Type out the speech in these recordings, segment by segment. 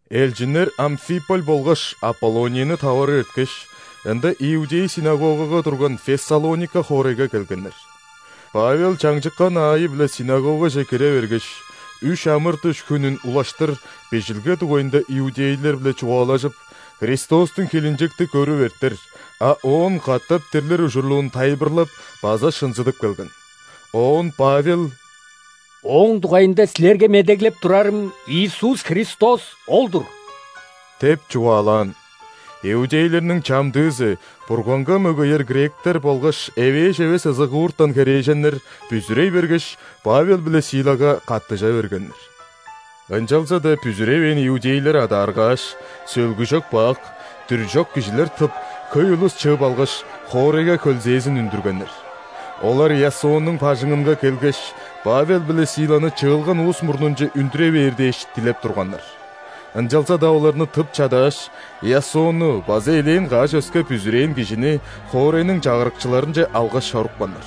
Элчиннер Амфиполь болгаш Аполлонияны таварып эрткеш, ында иудей ·синагога турган Фессалоника хоорайга келгеннер. Павел чаңчыккан аайы-биле синагогаже кире бергеш, үш ·амыр-дыш хүнүн улаштыр Бижилге дугайында иудейлер-биле чугаалажып, Христостуң хилинчекти көрүп эртер, а оон катап дирлир ужурлуун тайылбырлап база шынзыдып келген. Оон Павел: «Ооң дугайында силерге медеглеп турарым Иисус – Христос ол-дур» – деп чугаалаан. Иудейлерниң чамдыызы, Бурганга мөгеер гректер болгаш эвээш эвес ызыгууртан херээженнер, бүзүрей бергеш, Павел биле Силага каттыжа бергеннер. Ынчалза-даа бүзүревээн иудейлер адааргааш, сөлгүжок бак, дүржок кижилер тып, хөй улус чыып алгаш, хоорайга хөлзээзин үндүргеннер. Олар Иасоннуң бажыңынга келгеш, Павел биле Силаны чыылган улус мурнунче үндүре бээр дээш, дилеп турганнар. Ынчалза-даа оларны тып чадааш, Иасонну база элээн каш өске бүзүрээн кижини хоорайның чагырыкчыларынче алгаш чорупканнар.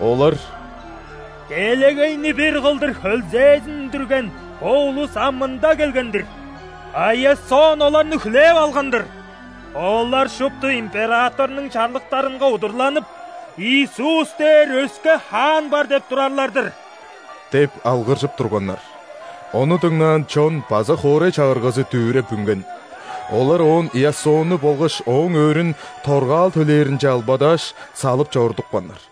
Олар: «Делегейни бир кылдыр хөлзээзин үндүрген бо улус ам мында келген-дир! А Иасон оларны хүлээп алган-дыр. Олар шупту императорнуң чарлыктарынга удурланып: „Иисус дээр өске хаан бар“ – деп турарлар-дыр» – деп алгыржып турганнар. Ону дыңнаан чон база хоорай чагыргазы дүвүреп үнген. Олар оон Иасонну болгаш ооң өөрүн торгаал төлээринче албадааш, салып чорудупканнар.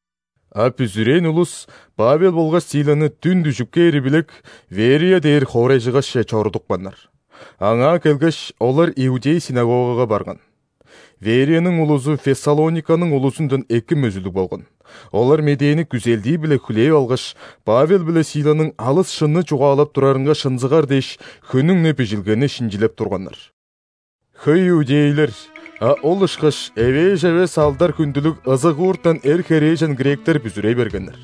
А бүзүрээн улус Павел болгаш Силаны дүн дүжүп кээри билек, Верия дээр хоорайжыгашче чорудупканнар. Аңаа келгеш, олар иудей ·синагогага барган. Верияның улузу Фессалониканың улузундан эки мөзүлүг болган: олар медээни күзелдии-биле хүлээп алгаш, Павел биле Силаның алыс шынны чугаалап турарынга шынзыгар дээш, хүннүң-не Бижилгени шинчилеп турганнар. Хөй иудейлер, а ол ышкаш эвээш эвес алдар-хүндүлүг ызыгууртан эр, херээжен гректер бүзүрей бергеннер.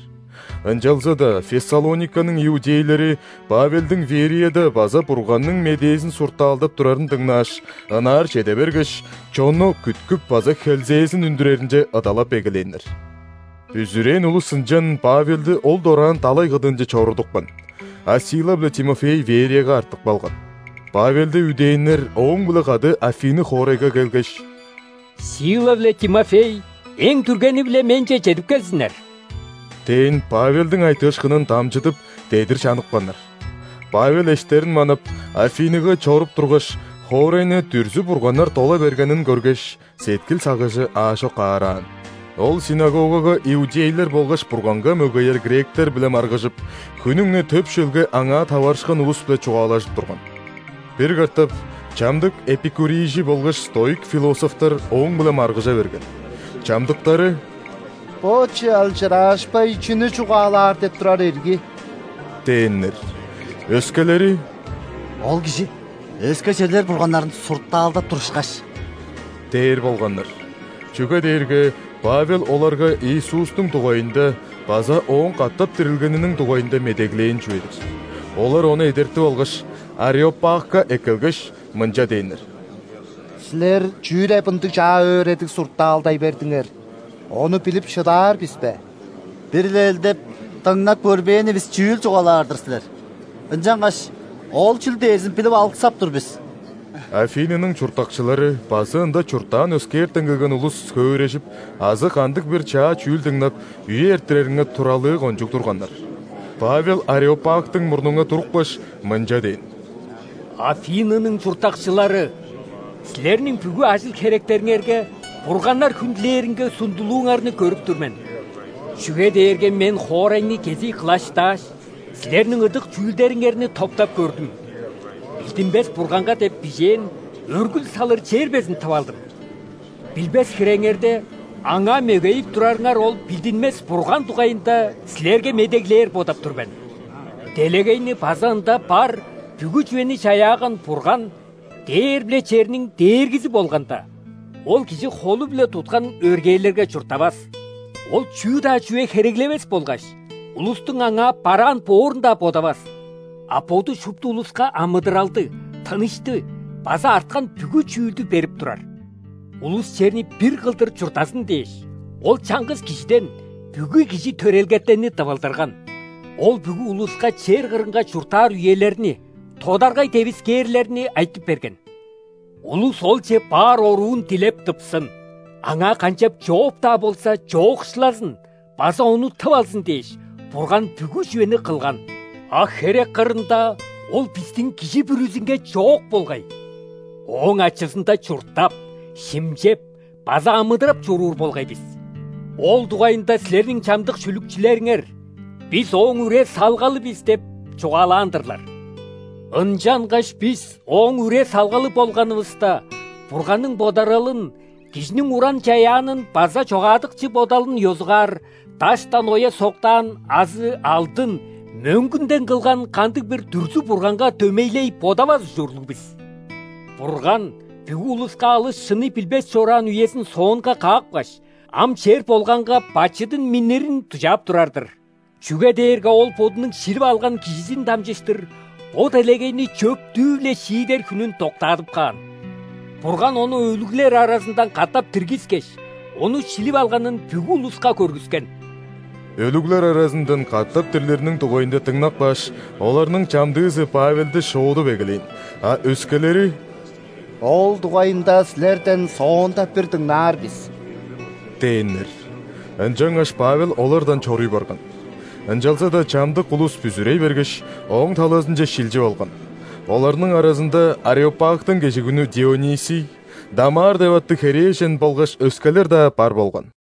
Ынчалза-даа Фессалониканың иудейлери Павелдиң Верияда база Бурганның медээзин суртаалдап турарын дыңнааш, ынаар чеде бергеш, чонну күткүп база хөлзээзин үндүреринче ыдалап эгелээннер. Бүзүрээн улус ынчан Павелди ол дораан далай кыдыынче чорудупкан, а Сила биле Тимофей Верияга артып калган. Павелди үдээннер ооң-биле кады Афины хоорайга келгеш: «Сила биле Тимофей эң дүргени-биле менче чедип келзиннер» – дээн Павелдиң айтыышкынын дамчыдып, дедир чаныпканнар. Павел эштерин манап, Афиныга чоруп тургаш, хоорайны дүрзү-бурганнар дола бергенин көргеш, сеткил-сагыжы аажок аараан. Ол ·синагогага иудейлер болгаш Бурганга мөгеер гректер-биле маргыжып, хүннүң-не төп шөлге аңаа таварышкан улус-биле чугаалажып турган. Бир катап чамдык эпикурийжи болгаш стоик философтар ооң-биле маргыжа берген. Чамдыктары: «Бо чалчыраашпай чүнү чугаалаар деп турар ирги?» – дээннер. Өскелери: «Ол кижи өске черлер бурганнарын суртаалдап тур ышкаш» – дээр болганнар, чүге дээрге Павел оларга Иисустуң дугайында база Ооң катап дирилгениниң дугайында медеглээн чүве-дир. Олар ону эдертип алгаш, ареопагка эккелгеш, мынча дээннер: «Силер чүү деп ындыг чаа өөредиг суртаалдай бердиңер, ону билип шыдаар бис бе? Бир-ле элдеп, дыңнап көрбээнивис чүүл чугаалаар-дыр силер. Ынчангаш ол чүл дээрзин билип алыксап тур бис». (Афинының чурттакчылары база ында чурттаан өскээртен келген улус хөөрежип азы кандыг-бир чаа чүүл дыңнап, үе эрттиреринге туралыы кончуг турганнар.) Павел ареопагтың мурнунга турупкаш, мынча дээн: «Афинының чурттакчылары! Силерниң бүгү ажыл-херектериңерге бурганнар хүндүлээринге сундулууңарны көрүп тур мен. Чүге дээрге мен хоорайны кезий кылаштааш, силерниң ыдык чүүлдериңерни топтап көрдүм. „Билдинмес Бурганга“ деп бижээн өргүл салыр чер безин тып алдым. Билбес хиреңерде, Аңаа мөгейип турарыңар ол билдинмес Бурган дугайында силерге медеглээр бодап тур мен. Делегейни база ында бар бүгү чүвени чаяаган Бурган дээр биле черниң Дээргизи болганда, Ол кижи холу-биле туткан өргээлерге чурттавас. Ол чүү-даа чүве хереглевес болгаш, улустуң Аңаа бараан боорун-даа бодавас, а Боду шупту улуска амыдыралды, тынышты база арткан бүгү чүүлдү берип турар. Улус черни бир кылдыр чурттазын дээш, Ол чаңгыс кижиден бүгү кижи төрелгетенни тывылдырган. Ол бүгү улуска чер кырынга чурттаар үелерни, тодаргай девискээрлерни айтып берген. Улус Олче баар оруун дилеп тыпсын, Аңаа канчап-чооп-даа болза чоокшулазын база Ону тып алзын дээш, Бурган бүгү чүвени кылган, а херек кырында Ол бистиң кижи бүрүзүнге чоок болгай. Ооң ачызында чурттап, шимчеп база амыдырап чоруур болгай бис. Ол дугайында силерниң чамдык шүлүкчүлериңер: „Бис – Ооң үре-салгалы бис“ – деп чугаалаан-дырлар. Ынчангаш бис Ооң үре-салгалы болганывыста, Бурганның бодаралын кижиниң уран чаяанын база чогаадыкчы бодалын ёзугаар даштан оя соктаан азы алдын, мөңгүнден кылган кандыг-бир дүрзү-бурганга дөмейлей бодавас ужурлуг бис. Бурган бүгү улуска алыс шынны билбес чораан үезин соонга каапкаш, ам чер болганга бачыдын миннирин дужаап турар-дыр. Чүге дээрге Ол Бодунуң шилип алган Кижизин дамчыштыр бо делегейни чөптүү-биле шиидер хүнүн доктаадып каан. Бурган Ону өлүглер аразындан катап диргискеш, Ону шилип алганын бүгү улуска көргүскен». Өлүглер аразындан катап дирлириниң дугайында дыңнап кааш, оларның чамдыызы Павелди шоодуп эгелээн, а өскелери: «Ол дугайында силерден соонда бир дыңнаар бис» – дээннер. Ынчангаш Павел олардан чоруй барган. Ынчалза-даа чамдык улус бүзүрей бергеш, ооң талазынче шилчип алган: оларның аразында Ареопагтың кежигүнү Дионисий, Дамар деп аттыг херээжен болгаш өскелер-даа бар болган.